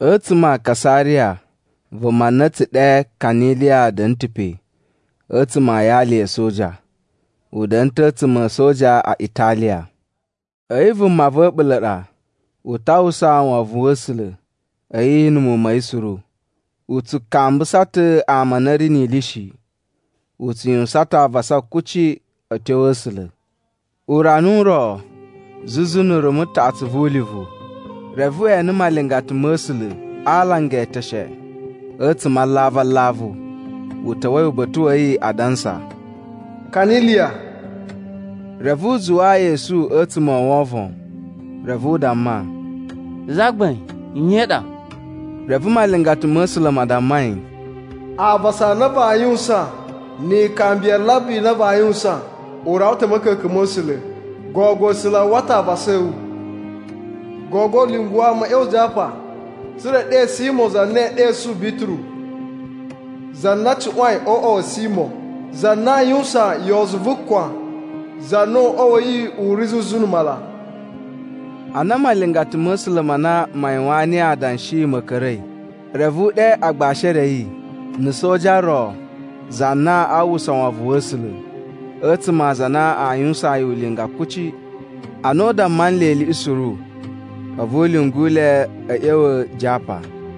A̱tsuma̱ a Kasariya vuma na a̱ tsu ɗe Kaniliya da̱na̱ ta̱ pe a̱tsuma̱ a yali ya̱ a̱soja, u da̱na̱ ta̱ a̱tsuma̱ a̱ A̱soja a Italiya. A̱yi vuma va̱ a̱ɓula̱ ɗa. U ta uwwusa wovon wa̱ A̱sula̱, a̱yi na̱ muwun ma̱ yi suru. U tsu kambusa ta̱ ama a na a̱ ri ni ili shi. U tsu yuwusan ta̱ avasa kuci a̱ tyo a̱ A̱sula̱. Urana u ro, zuzu na̱ rumu taꞌatsu vu ulivu, reve we ene malingata ma̱ A̱sula̱ a alanga e eteshe a̱tsuma̱ a alavu alavu, u ta̱wa̱i uba̱ta̱ wa̱ yi, adansa, “Kaniliya!” Reve u zuwaa yi esu a̱tsuma̱ o wovon, reve u damma, “Zagbain nye i ɗa?” Reve malingata ma̱ A̱sula̱ ma damma yi, “Avasa a na vaa yuwusan ni ikambi ya alambi a na vaa yuwusan u rawa ta̱ a̱ ma̱ka̱ka̱n ma̱ A̱sula̱. Gogo A̱sula̱ a uwwa ta̱ avasa a̱ wu. Gogo lyungu ama a̱ ꞌya̱wa̱ Japa tsa̱ra̱ e ɗe Simo za na ee ɗesu Bituru. Za na cuꞌwain o uꞌwa wa̱ Simo za na aa yuwusan yozu vu kwan, za na uꞌwa wa̱ yi u ri zuzu na̱ mala.” Ana malingata ma̱ A̱sula̱ ma na ma yuwaan niyi adanshi ma̱ ka̱ra̱i, reve u ɗe agbashi e re a̱ yi, na̱ soja ro, za na a uwwusa wovon wa̱ A̱sula̱, a̱tsuma̱ a aza a na a yuwusaan yi ulinga kuci. Ana u damma nle iliꞌi suru, a̱vu u lyungu le a̱ ꞌya̱wa̱ Japa.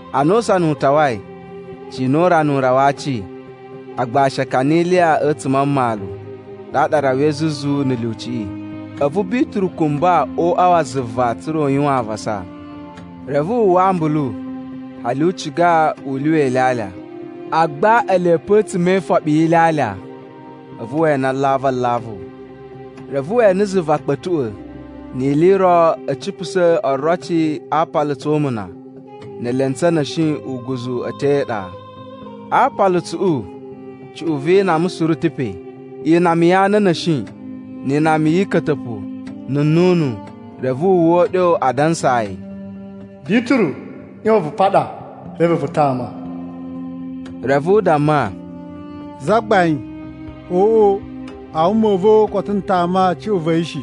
Ana usana u tawai, cina urana u rawa a aci, agbashi a Kaniliya a̱tsuma̱ a mmalu, ɗaɗa a rawai zuzu na̱ lyuciꞌi. A̱vu Bituru kumba o uꞌwa wa zuva tsa̱ra̱ u yuwan avasa. Reve wu uwwa ambulu, hali u ciga u lyuwa ilyalya. Agba ele pe a̱tsuma̱ e ifoɓi yi ilyalya, a̱vu we ene alavu alavu. Reve we ene zuva kpa̱tuꞌwa̱, ni ili i ro a̱ cipusa̱ oroci a aapalutsu o umuna ne elentsu a̱ na̱shi uguzu a̱ tyo e iɗa. A aapalutsuꞌu cuꞌun vi inama suru a̱ ta̱ pe: inama ya ana a̱ na̱shi, ni inama yi ika̱ta̱pu, na̱ nnunu. Reve wu uwwa uɗyo adansa yi, “Bituru, ꞌyon vu paɗa, reve vu tama.” Reve u damma, “Zagbain, oꞌo! A wuma u va̱ koto n tama cuꞌun va̱ yi shi,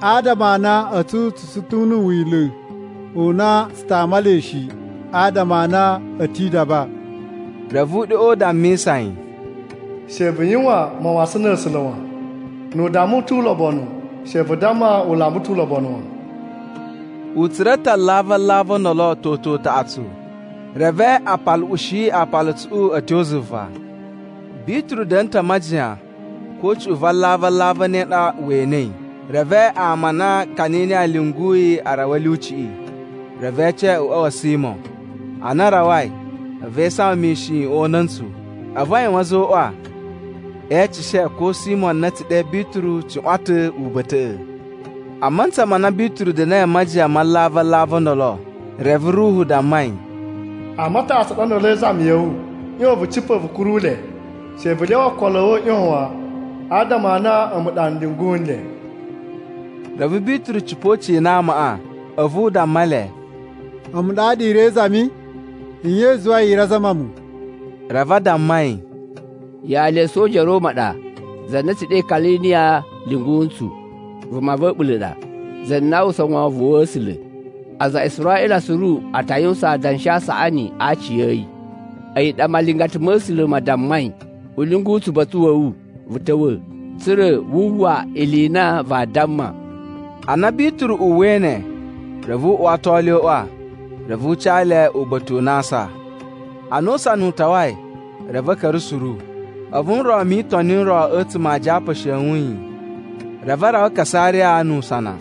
adama a na a̱tsu tsu tsu ta̱ na̱ Wila̱ u na tsu tama le shi, adama a na a̱ ti idaba.” Reve uɗyoꞌo u dammisa yi, “She vu yuwan mawasan na̱ A̱sula̱ wan. Nu u damma u tu ulobonu she vu damma u lamba ta̱ ulobonu wan.” U tsura̱ ta̱ alavu alavu o ndolo toto utaꞌatsu. Reve a paluꞌushi aapalutsuꞌu a̱ tyo zuva. Bituru da̱na̱ ta̱ a majiyan, ko cuꞌun va alavu alavu e ne ɗa we enei. Reve ama a na Kaniliya lyunguyi a rawa a̱ lyuciꞌi, reve e ece uꞌwa wa̱ Simo. Ana a rawai, a̱vu e isawan mishin o una̱ntsu. A̱vu a yuwan a̱zoꞌwa, e eceshe ko Simo na a̱ tsu ɗe Bituru cuꞌwan ta̱ uba̱ta̱ꞌa̱. A mantsa ma na Bituru da̱na̱i a majiyan ma alavu alavu o ndolo, reve Ruhu damma yi, “Ama a taꞌatsu a ɗa ndolo e izami ya̱ wu. ꞌYon vu cipa̱ vu kuru le. She vu lyawa ookolo a̱ wu a̱ ꞌyon wan, adama a na a̱mu ɗa n lyungu nle.” Reve Bituru cipa̱ u cina amaꞌa, a̱vu u damma le, “A̱mu ɗaɗa i ri e izami. Nye i zuwai i ri azama mu?” Reve a damma yi, “Yali ya̱ a̱soja ya̱ Roma ɗa, za na a̱ tsu ɗe Kaniliya lyungu ntsu. Vuma va̱ a̱ɓula̱ ɗa, za na a uwwusa wovon wa̱ A̱sula̱. Aza a Israꞌila suru a ta yuwusan adanshi a saꞌani a aci a̱ yi. A̱yi ɗa malingata ma̱ A̱sula̱ ma dammai u lyungu tsu uba̱ta̱ wa̱ wu vu ta̱wa̱, tsa̱ra̱ wu uwwa ili i na vaa damma.” Ana Bituru uwwai ne, reve u uwato le o uꞌwa, reve u ca le uba̱ta̱ u na aa asa. Ana usana u tawai, reve a̱ ka̱ra̱ suru, a̱vu nron mi Itoni n ro a̱tsuma̱ a Japa e shewun yi. Reve a rawa Kasariya nu usana.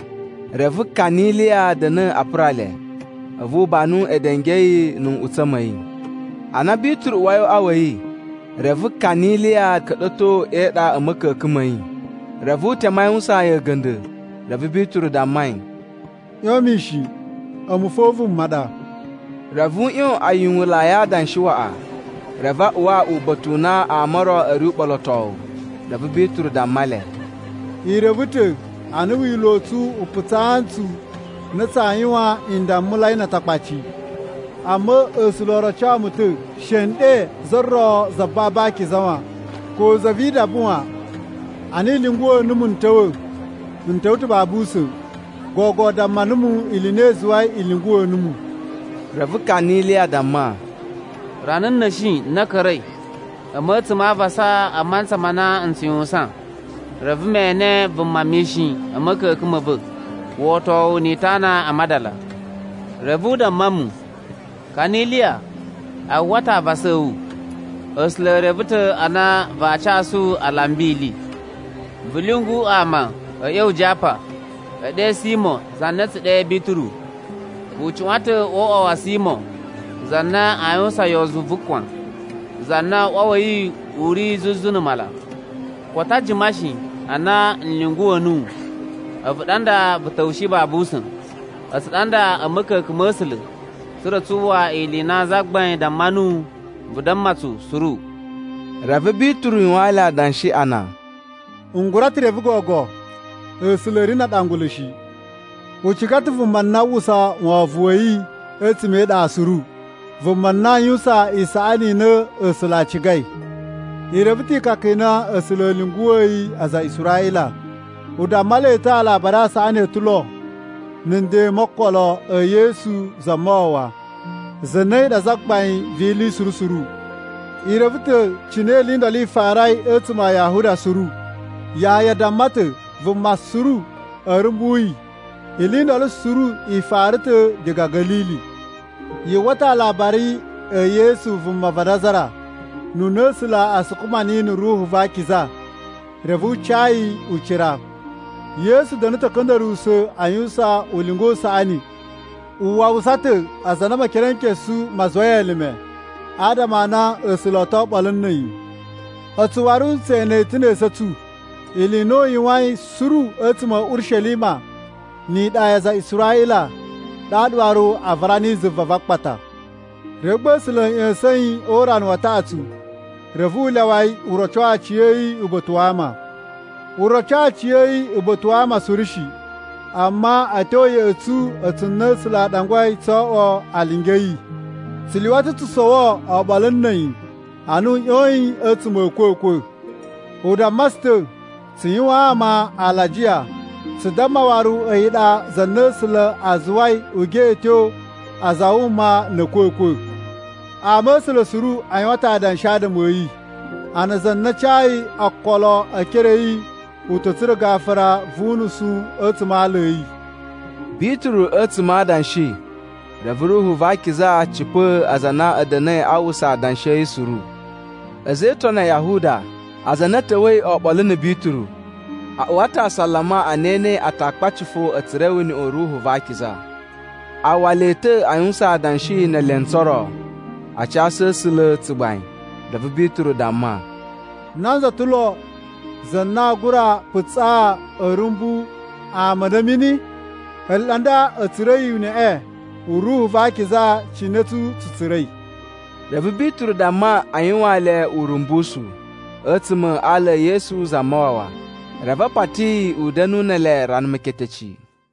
Reve Kaniliya da̱na̱ a pura le, a̱vu u banu edenge a̱ yi na̱ nꞌutsa̱ ma̱ yi. Ana Bituru uwai o uꞌwa wa̱ yi, reve Kaniliya ka̱ɗa̱to e iɗa a̱ ma̱ka̱ka̱n ma̱ yi. Reve u teme a yuwusaan yi a̱ga̱nda̱. Reve Bituru damma yi, “ꞌYon mishin a̱mu fo vuma ɗa.” Reve u ꞌyon a yuwunlai adanshi waꞌa, reve a uwa uba̱ta̱ u na ama o ro a̱ ri uɓolotowu. Reve Bituru damma le, “I reve ta̱ a na Wila̱ u tsu u putsaa ntsu a na tsaa yuwan ndammulai na Atakpaci. Amma A̱sula̱ o roco mu ta̱ she n ɗe za ro za babu akiza wan, ko za vi idaba wan. Ana i lyunguwa̱ numu n ta̱wa̱, n ta̱wa̱ ta̱ babu usa̱n. Gogo damma numu ili i na i zuwai i lyunguwa̱ numu.” Reve Kaniliya damma, “Rana na̱shi na ka̱ra̱i, a̱mu a̱tsuma̱ a avasa a mantsa ma na n tsu yuwusan. Reve me ene vuma mishin a̱ ma̱ka̱ka̱n ma̱ va̱ wotowu ni itana a madala. Reve u damma mu, ‘Kaniliya, a uwwa ta̱ avasa a̱ wu, A̱sula̱ e reve ta̱ a na vaa casu alambi ili. Vu lyungu ama a̱ ꞌya̱wa̱ Japa e ɗe Simo za na a̱ tsu ɗe Bituru. U cuꞌwan ta̱ o uꞌwa wa̱ Simo, za na aa yuwusan yozu vu kwan, za na uꞌwa wa̱ yi u ri zuzu na̱ mala.’ Koto a jima shi a na n lyunguwa̱ nuwu, a̱vu ɗa nda vu ta̱wushi babu usa̱n. A̱tsu ɗa nda a̱ ma̱ka̱ka̱n ma̱ A̱sula̱, tsa̱ra̱ tsu uwwa ili i na Zagbain damma nuwu vu damma tsu suru.” Reve Bituru yuwaan le adanshi a na, “N gura ta̱ reve gogo, A̱sula̱ a̱ ri na aɗangulu shi. U ciga ta̱ vuma na a uwwusa wovon wa̱ yi a̱tsuma̱ e iɗa suru, vuma na a yuwusan isaꞌani i na A̱sula̱ a cigai. I reve ta̱ ikaka i na A̱sula̱ a̱ lyunguwa̱yi aza a Israꞌila. U damma le ta̱ Alabari a Saꞌani o ta̱ lo, na̱ nden mo okolo e Yesu Zamawawa, za na a̱yi ɗa Zagbain vi ili suru suru. I reve ta̱ cine ili i ndolo i farai a̱tsuma̱ a Yahuda suru. Yahaya damma ta̱ vuma suru a̱ rumbu yi, ili i ndolo suru i fara ta̱ diga Ga̱lili. Yu uwwa ta̱ alabari e Yesu vuma va Nazara, ununa A̱sula̱ a sukuma niyi na̱ Ruhu va Akiza, reve u ca yi ucira. Yesu da̱na̱ ta̱ a̱ ka̱nda̱ruwusa̱ a yuwusan ulinga u saꞌani. U wawusa ta̱ aza a na Mekerenkesu ma zuwai elime, adama a na A̱sula̱ o to oɓolo na̱ a̱yi. “A̱tsu waru tse ene ta̱ ne esu a̱ tsu ili i na u yuwain suru a̱tsuma̱ a̱ Urishelima ni iɗa ya aza a Israꞌila. Ɗaɗa waru a vara niyi zuva va akpata. Reve gba A̱sula̱ a̱ ꞌya̱sa̱n yi o urana wa taꞌatsu, reve u lyawa yi u roco aciya̱yi uba̱ta̱ wa ama. U roco aciya̱yi uba̱ta̱ wa ama suru shi, amma a̱ tyo ya̱ꞌa̱ tsu, a̱tsu na A̱sula̱ a ɗangwai tso oꞌwo alingi a̱ yi. Tsu lyuwa ta̱ tsu sowo oɓolo na̱ a̱yi ana u ꞌyoyin a̱tsuma̱ a̱ a̱kwa̱kwa̱. U damma tsu ta̱ tsu yuwaan ama alajiya, tsu damma waru a̱yi ɗa za na A̱sula̱ a zuwai u geꞌeto aza a wuma na̱ a̱kwa̱kwa̱. Ama̱sula̱ suru a yuwan ta̱ adanshi adama a̱ yi, a na za na cayi okolo e ekere a̱ yi u ta̱ tsura̱ gafura vu unusu a̱tsuma̱ a ala a̱ yi.” Bituru a̱tsuma̱ a adanshi, reve Ruhu va Akiza cipa̱a̱ aza a na a̱ da̱na̱i a uwwusa adanshi a̱ yi suru. A̱za̱ e Itoni a Yahuda, aza a na a̱ ta̱wa̱i oɓolo na̱ Bituru a uwa ta̱ asalama a na e enei Atakpaci fo a̱ tsura̱i uneꞌe u Ruhu va Akiza. A uwwa le ta̱ a yuwusan adanshi ne elentsu o ro, a casu A̱sula̱ tsugbain. Reve Bituru damma, “Nanza ta̱ lo za na aa gura putsaa a̱ rumbu ama a nda a̱ mini? Ele ɗa nda a̱ tsura̱i uneꞌe u Ruhu va Akiza cine a̱tsu tsu tsura̱i.” Reve Bituru damma a yuwaan le urumbusu a̱tsuma̱ a ala e Yesu Zamawawa. Reve a pati yi u da̱nu ne ele rana meketeci.